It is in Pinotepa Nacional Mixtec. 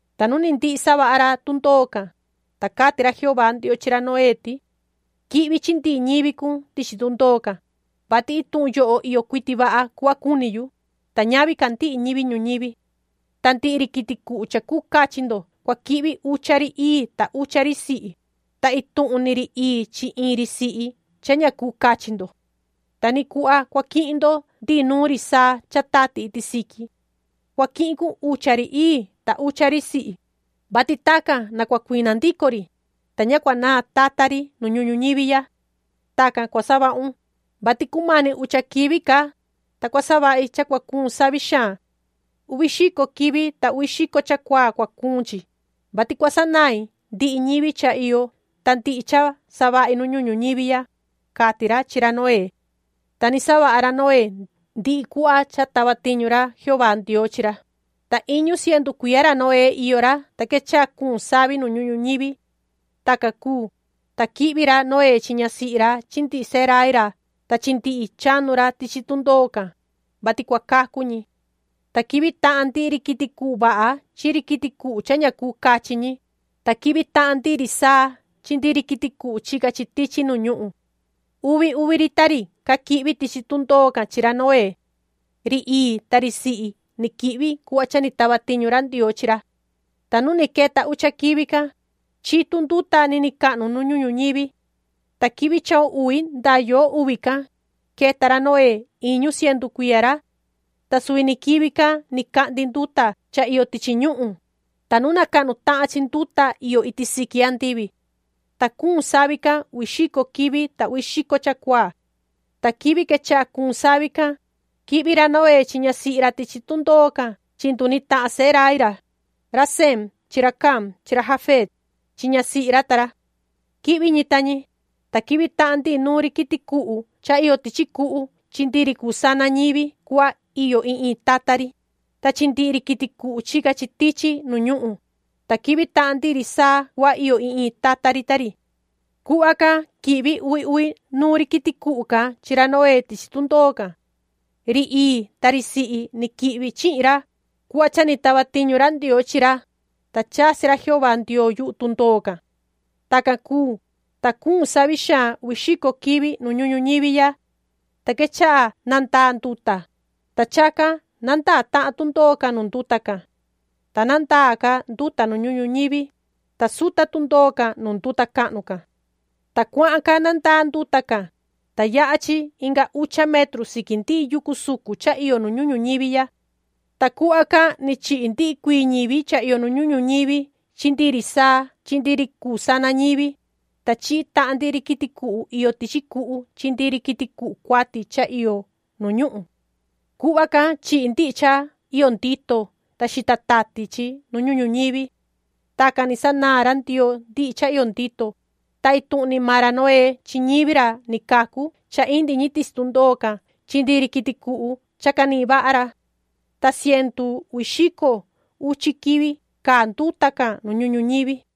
Ta nu ni ndihi savaha ra tundoo can, ta cati ra Jehová Ndioo chi ra Noé ti:” Quihvi chi ndihi ñivi cun tichi tundoo can, vati ituhun yoho iyo cuiti vaha cuhva cuni yu, ta ñavi ca ndihi ñivi ñuñivi. Ta ndihi ri quiti cuhu cha cuu cachi ndo cua quihvi ucha ri ii ta ucha ri sihi, ta ituhun ni ri ii chi iin ri sihi cha ña cuu cachi ndo. Ta ni cuhva cua quihin ndo ndihi nuun ri saa cha tati iti siqui. Cua quihin cun ucha ri ii ta ucha ri sihi, vati tacan na cua cuina ndico ri, ta ña cua naan tata ri nu ñuhun ñuñivi ya. Tacan cua savahun, vati cumani ucha quivi ca, ta cua savahi cha cua cuun savi xaan. Uvi xico quivi ta uvi xico chacuaa cua cuun chi, vati cua sanain ndihi ñivi cha iyo ta ndihi cha savahi nu ñuhun ñuñivi ya”, cati ra chi ra Noé. Ta ni savaha ra Noé ndihi cuhva cha tava tiñu ra Jehová Ndioo chi ra. Ta iñu cientu cuiya ra Noé iyo ra, ta quechaha cuun savi nu ñuhun ñuñivi. Tacan cuu, ta quihvi ra Noé chi ñasihi ra chi ndihi sehe rai ra ta chi ndihi chanu ra tichi tundoo can, vati cua cacu ñi. Ta quihvi tahan ndihi ri quiti cuhu vaha chi ri quiti cuhu cha ña cuu cachi ñi, ta quihvi tahan ndihi ri saa chi ri quiti cuhu chica chi tichi nu ñuhun. Uvi uvi ri ta ri ca quihvi tichi tundoo can chi ra Noé. Ri ii ta ri sihi ni quihvi cuhva cha ni tava tiñu ra Ndioo chi ra. Ta nu ni queta ucha quivi can, chitu nduta niniin cahnu nu ñuhun ñuñivi. Ta quivi chahun uvi ndaa yoo uvi can, queta ra Noé iñu cientu cuiya ra. Ta suvi ni quivi can ni cahndi nduta cha iyo tichi ñuhun, ta nuna cahnu tahan chi nduta iyo iti siqui andivi. Ta cuun savi can uvi xico quivi ta uvi xico chacuaa. Ta quivi quechaha cuun savi can, quihvi ra Noé chi ñasihi ra tichi tundoo can chi nduni tahan sehe rai ra, ra Sem chi ra Cam chi ra Jafet, chi ñasihi ra ta ra. Quihvi ñi ta ñi, ta quihvi tahan ndihi nuun ri quiti cuhu cha iyo tichi cuhu chi ndihi ri cuu sana ñivi cuhva iyo iin iin tata ri, ta chi ndihi ri quiti cuhu chica chi tichi nu ñuhun, ta quihvi tahan ndihi ri saa cuhva iyo iin iin tata ri ta ri. Cuhva can quihvi uvi uvi nuun ri quiti cuhu can chi ra Noé tichi tundoo can. Ri ii ta ri sihi ni quihvi chihin ra cuhva cha ni tava tiñu ra Ndioo chi ra, ta chasi ra Jehová Ndioo yuhu tundoo can. Tacan cuu, ta cuun savi xaan uvi xico quivi nu ñuhun ñuñivi ya. Ta quechaha nandaa nduta, ta chacan nandaa tahan tundoo can nu nduta can. Ta nandaa ca nduta nu ñuhun ñuñivi, ta suta tundoo can nu nduta cahnu can. Ta cuahan ca nandaa nduta can, ta yaha chi inga ucha metru siqui ndihi yucu sucun cha iyo nu ñuhun ñuñivi ya. Ta cuhva can ni chihi ndihi cuii ñivi cha iyo nu ñuhun ñuñivi chi ndihi ri saa chi ndihi ri cuu sana ñivi, ta chihi tahan ndihi ri quiti cuhu iyo tichi cuhu chi ndihi ri quiti cuhu cuati cha iyo nu ñuhun. Cuhva can chihi ndihi cha iyo ndito ta xita tati chi nu ñuhun ñuñivi. Tacan ni sanaan ra Ndioo ndihi cha iyo ndito, ta ituhun ni maan ra Noé chi ñivi ra ni cacu cha indi ñi tichi tundoo can chi ndihi ri quiti cuhu cha canihin vaha ra. Ta cientu uvi xico uchi quivi caa nduta can nu ñuhun ñuñivi.